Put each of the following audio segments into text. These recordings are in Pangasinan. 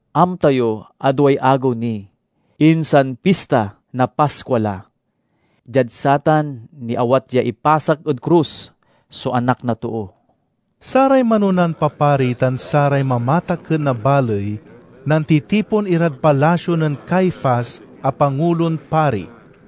"Amta yo a duay agew ni, insan Pista na Paskua la. Diad satan niawat ya ipasak ed krus so Anak na Too." Saray manonan papari tan saray mamatakken na baley nantitipon irad palasio nen Caifas, a Pangulon Pari.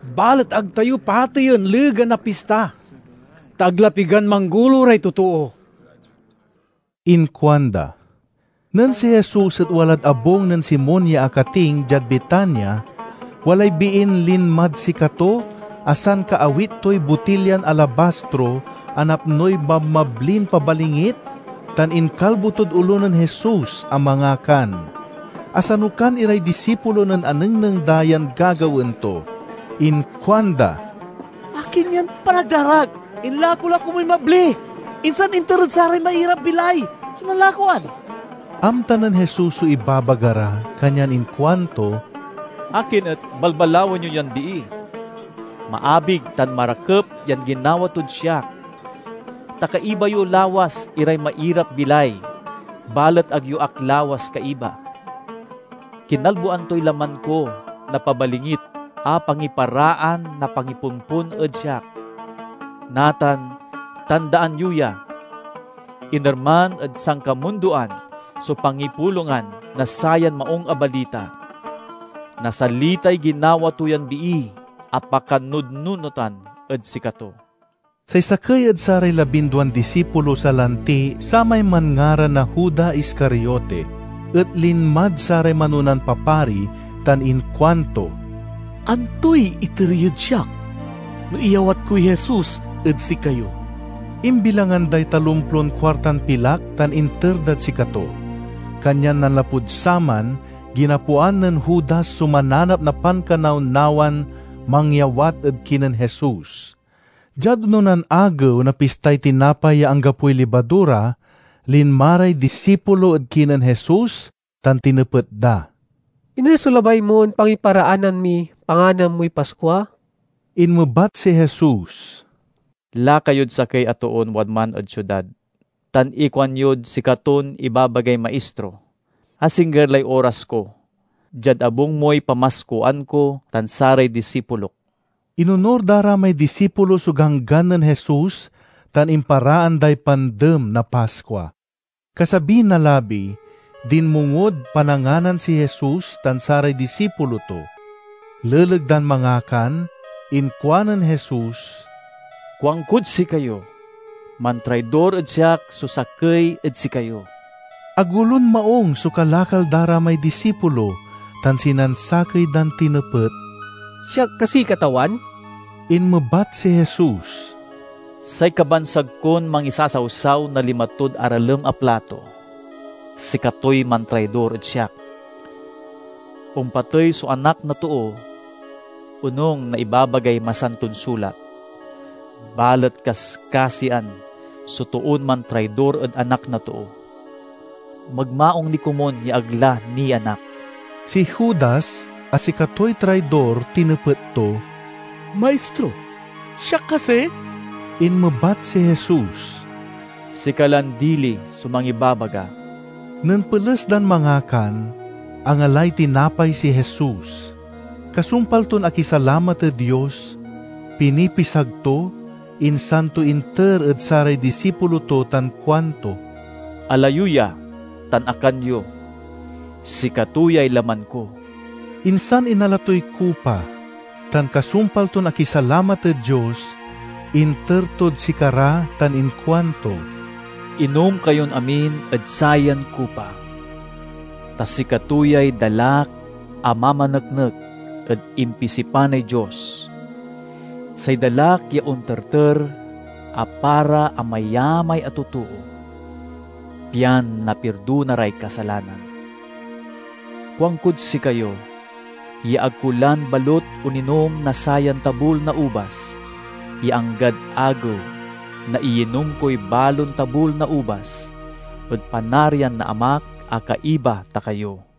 "Balet ag tayo pateyen legan na pista, ta ag la pigan manggolo ray totoo," inkuanda. Nen si Jesus et walad abung nen Simon ya akating, diad Betania, walay biin linmad sikato a sankaawit toy botilyan alabastro a napnoy mabmablin pabalingit tan inkalbo tod olo nen Jesus a mangakan. Asanukan iray disipulo nen anengneng da yan gagawaen to. Inkuanda, "Akin yan panagdarak? Inlako la komuy mabli, insan inter ed saray mairap-bilay so nanlakoan!" Amta nen Jesus so ibabaga ra, kanyan inkuanto, "Akin et balbalawen yo yan bii? Maabig tan marakep yan ginawa tod siak. Ta kaiba yo lawas iray mairap-bilay balet ag yo ak lawas kaiba. Kinalboan toy laman ko na pabalingit a pangiparaan na pangipompon ed siak. Natan, tandaan yo ya! Inerman ed sankamundoan so pangipulongan na sayan Maung a Balita, nasalitay ginawa to yan bii a pakanudnunotan ed sikato." Say sakey ed saray labinduan disipulo salanti samay manngaran na Juda Iscariote et linmad saray manonan papari tan inkuanto, "Antoy iter yod siak no iyawat koy Jesus ed sikayo?" Imbilangan day talomplon kuartan pilak tan inter dad sikato. Kanyan nanlapud saman, ginapoan nen Judas so mananap na pankanawnawan mangyawat ed kinen Jesus. Diad ononan agew na Pistay Tinapay ya Anggapoy Libadura, linma ray disipulo ed kinen Jesus tan tinepet da, "Iner so labay mon pangiparaanan miy panganan moy Paskua?" Inmebat si Jesus, "Laka yod sakey a toon wadman ed siudad tan ikuanyod sikaton ibabagay Maistro: 'Asingger lay oras ko. Diad abung moy pamaskuan ko tan saray disipulok.'" Inonur da ra may disipulo so ganggan nen Jesus, tan imparaan day Pandem na Paskua. Kasabi na labi, dinmongod pananganan si Jesus tan saray disipulo to. Leleg dan mangakan inkuanen Jesus, "Kuankod sikayo: mantraidor ed siak so sakey ed sikayo." Agolon maung so kalakal da ra may disipulo, tan sinansakey dan tinepet, "Siak kasi, Katawan?" Inmebat si Jesus, "Say kabansag kon mangisasawsaw na lima tod aralem a plato, sikatoy mantraidor ed siak. Ompatey so Anak na Too, onung na ibabagay Masanton Sulat, balet kaskasian so toon mantraidor ed Anak na Too! Magmaung ni komun ya ag la nianak!" Si Judas, a sikatoy traidor, tinepet to, "Maistro, siak kasi?" Inmebat si Jesus, "Sika lan dili so mangibabaga." Nen peles dan mangakan, angalay tinapay si Jesus. Kasumpal ton akisalamat ed Dios, pinipisag to, insan to inter ed saray disipulo to tan kuanto, "Ala yo ya tan akan yo; sikato yay laman ko." Insan inala toy kupa, tan kasumpal ton akisalamat ed Dios, inter tod sikara tan inkuanto, "Inom kayon amin ed sayan kupa, ta sikato yay dalak a mamaneknek ed impisipanay Dios, say dalak ya onterter a para amayamay a totoo, pian napirdona ray kasalanan. Kuankod sikayo ya ag ko lan balut oninom na sayan tabul na ubas ya anggad agew na iyinom koy balon tabul na ubas ed Panarian na Amak a kaiba ta kayo."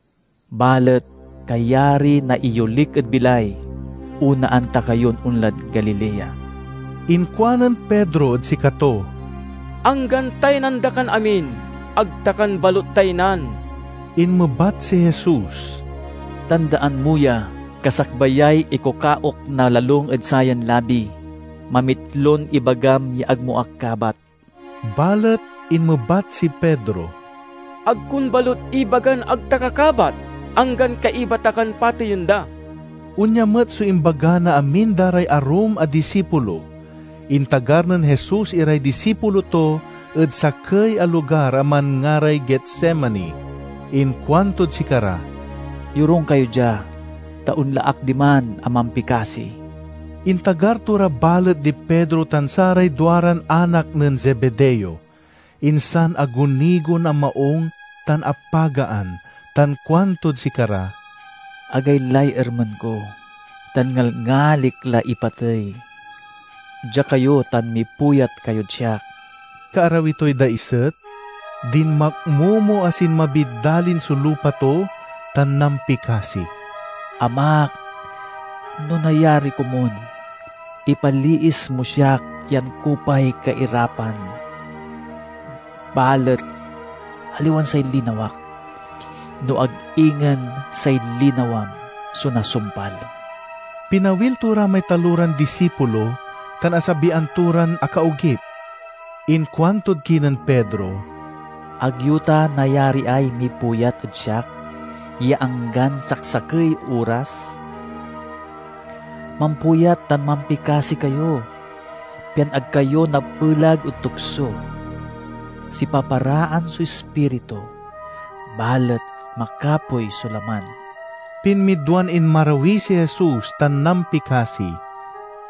Balet kayari na iyolik ed bilay, onaan ta kayon onlad Galilea." Inkuanen Pedro ed sikato, "Anggan taynan da kan amin, ag ta kan balut taynan!" Inmebat si Jesus, "Tandaan mo ya! Kasakbayay ikukaok na lalung ed sayan labi, mamitlon ibagam ya ag mo ak kabat." Balet inmebat si Pedro, "Ag kon balut ibagan ag ta ka kabat, anggan kaiba ta kan pateyen da!" Onya met so imbaga na amin da ray arum a disipulo. Intagar nen Jesus iray disipulo to ed sakey a lugar a manngaray Getsemani. Inkuantod sikara, "Yorung kayo dia, ta onla ak diman a mampikasi." Intagar to ra balet di Pedro tan saray duaran anak nen Zebedeo. Insan agunigon a maung tan apagaan tan kuantod sikara, "Agaylay ermen ko tan ngalngalik la ipatey. Dia kayo tan mipuyat kayod siak." Kaarawi toy daiset, dinmakmomo a sinmabid dalin so lupa to tan nampikasi, "Amak, no nayari komun, ipaliis mo siak yan kupay kairapan! Balet aliwan say linawak, no ag ingen say linawam, so nasumpal." Pinawil to ra may taloran disipulo, tan asabian to ran akaogip. Inkuantod kinen Pedro, "Ag yo ta nayariay mipuyat ed siak ya anggan saksakey oras? Mampuyat tan mampikasi kayo, pian ag kayo napelag ed tukso. Sipaparaan so ispiritu, balet makapoy so laman." Pinmidwan inmarawi si Jesus tan nampikasi,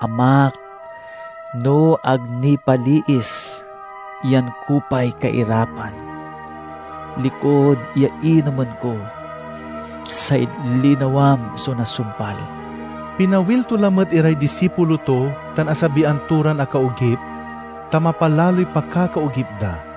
"Amak, no ag nipaliis yan kupay kairapan likud ya inomen ko, say linawam so nasumpal." Pinawil to lamet iray disipulo to tan asabian to ran akaogip, ta mapalaloy pakakaogip da.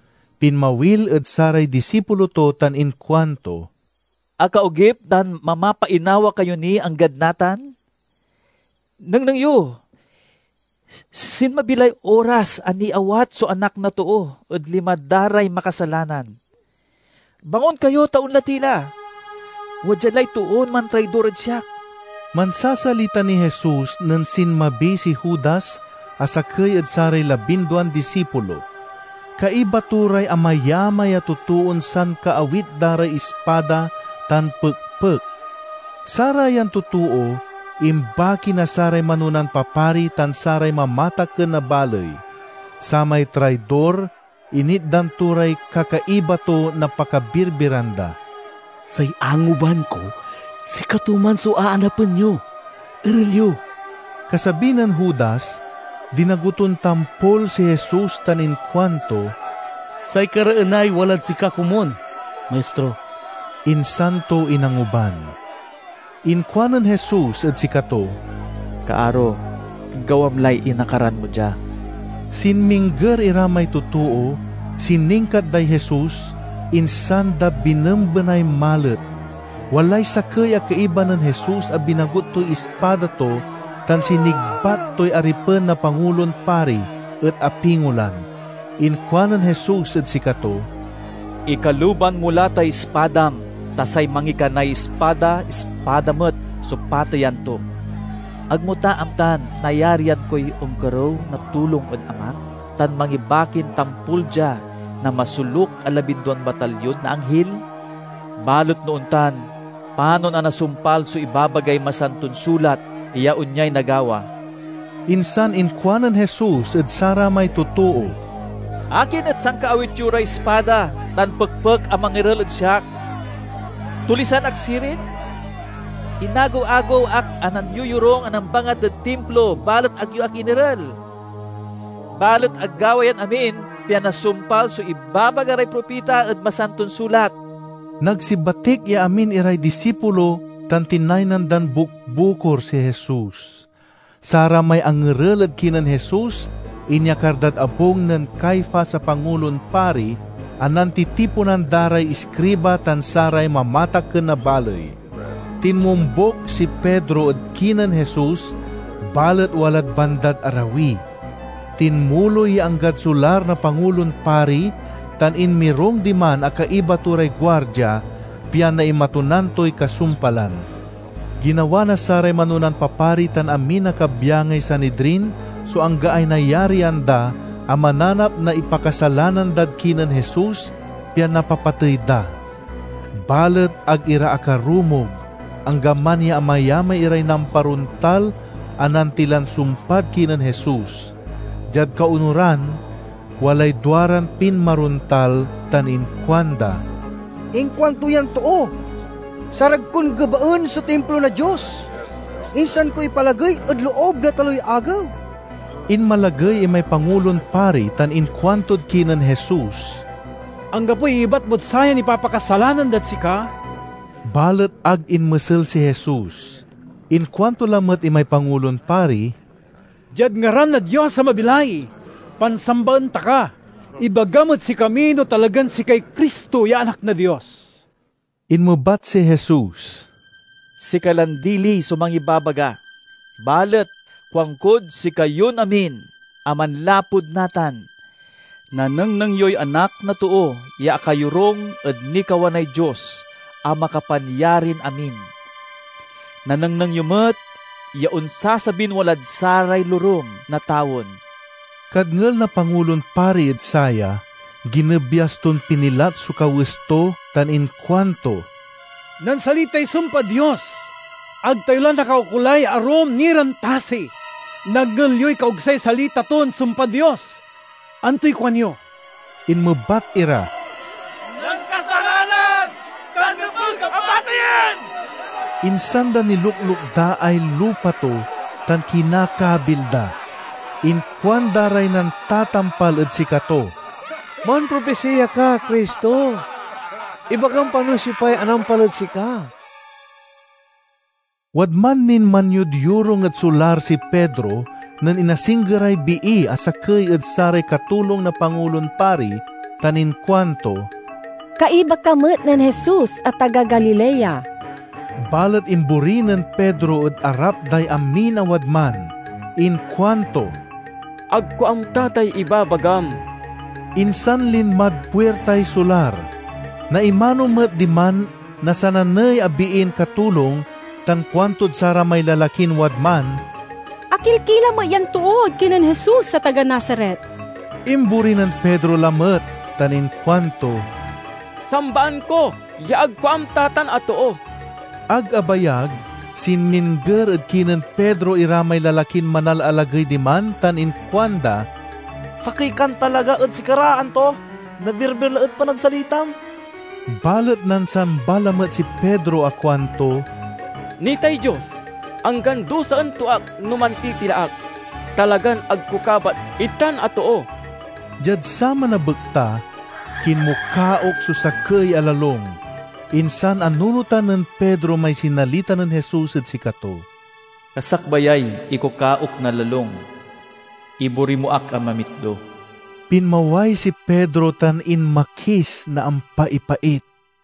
Pinmawil ed saray disipulo to tan inkuanto, "Akaogip tan mamapainawa kayo ni anggad natan? Nengneng yo! Sinmabi lay oras a niawat so Anak na Too ed lima da ray makasalanan. Bangon kayo, ta onla ti la. Wadya lay toon mantraidor ed siak!" Mansasalita niy Jesus nen sinmabi si Judas a sakey ed saray labinduan disipulo. Kaiba to ray amayamay a totoon sankaawit da ray ispada tan pekpek. Sarayan totoo imbaki na saray manonan papari tan saray mamatakken na baley. Samay traidor initdan to ray kakaiba to na pakabirbiran da: "Say anguban ko sikato man so aanapen yo. Erel yo!" Kasabi nen Judas, dinago ton tampol si Jesus tan inkuanto, "Say kareenay walad sika komun, Maistro," insan to inanguban. Inkuanen Jesus ed sikato, "Kaaro, gawam lay inakaran mo dia!" Sinmingger ira may totoo, siningkat day Jesus, insan da binembenay malet. Walay sakey a kaiba nen Jesus a binagut toy ispada to tan sinigbat toy aripen na Pangulon Pari, et apingolan. Inkuanen Jesus ed sikato, "Ikaluban mo la tay ispadam, ta say mangikanay ispada, ispada met so pateyan to. Ag mo ta amtan nayarian koy onkerew na tulong ed Amak, tan mangibakin tampol dia na masoluk a labinduan batalyon na anghil? Balet no ontan, panon a nasumpal so ibabagay Masanton Sulat ya onyay nagawa?" Insan inkuanen Jesus ed saramay totoo. "Akin et sankaawit yo ray ispada tan pekpek a mangerel ed siak? Tulisan ak sirin? Inagew-agew ak a nanyoyorung a nambangat ed Timplo, balet ag yo ak inerel. Balet agawa yan amin pian nasumpal so ibabaga ray propita ed Masanton Sulat." Nagsibatik ya amin iray disipulo tan tinaynan dan bukbukor si Jesus. Saramay angerel ed kinen Jesus inyakar dad abung nen Caifas a Pangulon Pari, a nantitiponan da ray iskriba tan saray mamatakken na baley. Tinmombuk si Pedro ed kinen Jesus, balet walad bandad arawi. Tinmuloy ya anggad solar na Pangulon Pari tan inmirung diman a kaiba to ray guardia, pian naimatunan toy kasumpalan. Ginawa na saray manonan papari tan amin a kabyangay Sanidrin so anggaay nayarian da a mananap na ipakasalanan dad kinen Jesus, pian napapatey da. Balet ag ira akarumog, anggaman ya amayamay iray namparontal a nantilan sumpad kinen Jesus. Diad kaonuran, walay duaran pinmarontal tan inkuanda, "Inkuanto yan too, 'Sarag kon gebaen so Timplo na Dios, insan ko ipaalagey ed loob na taloy agew.'" Inmalagey imay Pangulon Pari tan inkuantod kinen Jesus, "Anggapoy iyebat mod sayan ipapakasalanan dad sika?" Balet ag inmesel si Jesus. Inkuanto lamet imay Pangulon Pari, "Diad ngaran na Dios a mabilay, pansambaen ta ka: ibagam ed sikami no talagan sikay Cristo ya Anak na Dios." Inmebat si Jesus, "Sika lan dili so mangibabaga. Balet kuankod sikayon amin a manlapud natan, nanengneng yoy Anak na Too ya akayorung ed nikawanay Dios a Makapanyarin-amin. Nanengneng yo met ya onsasabin walad saray lorem na tawen!" Kadngel na Pangulon Pari ed saya, ginebyas ton pinilat so kawes to tan inkuanto, "Nansalitay sumpad Dios! Ag tayo la nakaukolay arum ni ran tasi! Nadngel yoy kaogsay salita ton sumpad Dios! Antoy kuanyo?" Inmebat ira, "Nankasalanan, tan nepeg a pateyen." Insan da niluklukdaay lupa to, tan kinakabil da. Inkuanda ray nantatampal ed sikato. "Mampropisiya ka, Cristo! Ibagam pa no siopay anampal ed sika?" Wadman nin manyodyorung ed solar si Pedro nen inasinggeray bii a sakey ed saray katulong na Pangulon Pari tan inkuanto, "Kaiba ka met nen Jesus a taga Galilea." Balet imbori nen Pedro ed arap day amin a wadman. Inkuanto, "Ag ko amta tay ibabagam." Insan linmad puirtay solar. Naimano met diman na sananey a biin katulong, tan kuantod saramay lalakin wadman, "Akilkila met yan too ed kinen Jesus a taga Nazaret." Imbori nen Pedro lamet tan inkuanto, "Sambaan ko ya ag ko amta tan a too!" Ag abayag, sinmingger ed kinen Pedro ira may lalakin manalalagey diman tan inkuanda, "Sakey kan talaga ed sikara, anto? Nabirbir la ed panagsalitam!" Balet nansamba lamet si Pedro a kuanto, "Nitay Dios, anggan dusaen to ak no mantitila ak. Talagan ag ko kabat itan a too!" Diad saman a bekta, kinmukaok so sakey a lalung. Insan anunotan nen Pedro may sinalita nen Jesus ed sikato, "Kasakbayay ikukaok na lalung, ibori mo ak a mamitlo." Pinmaway si Pedro tan inmakis na ampaipait.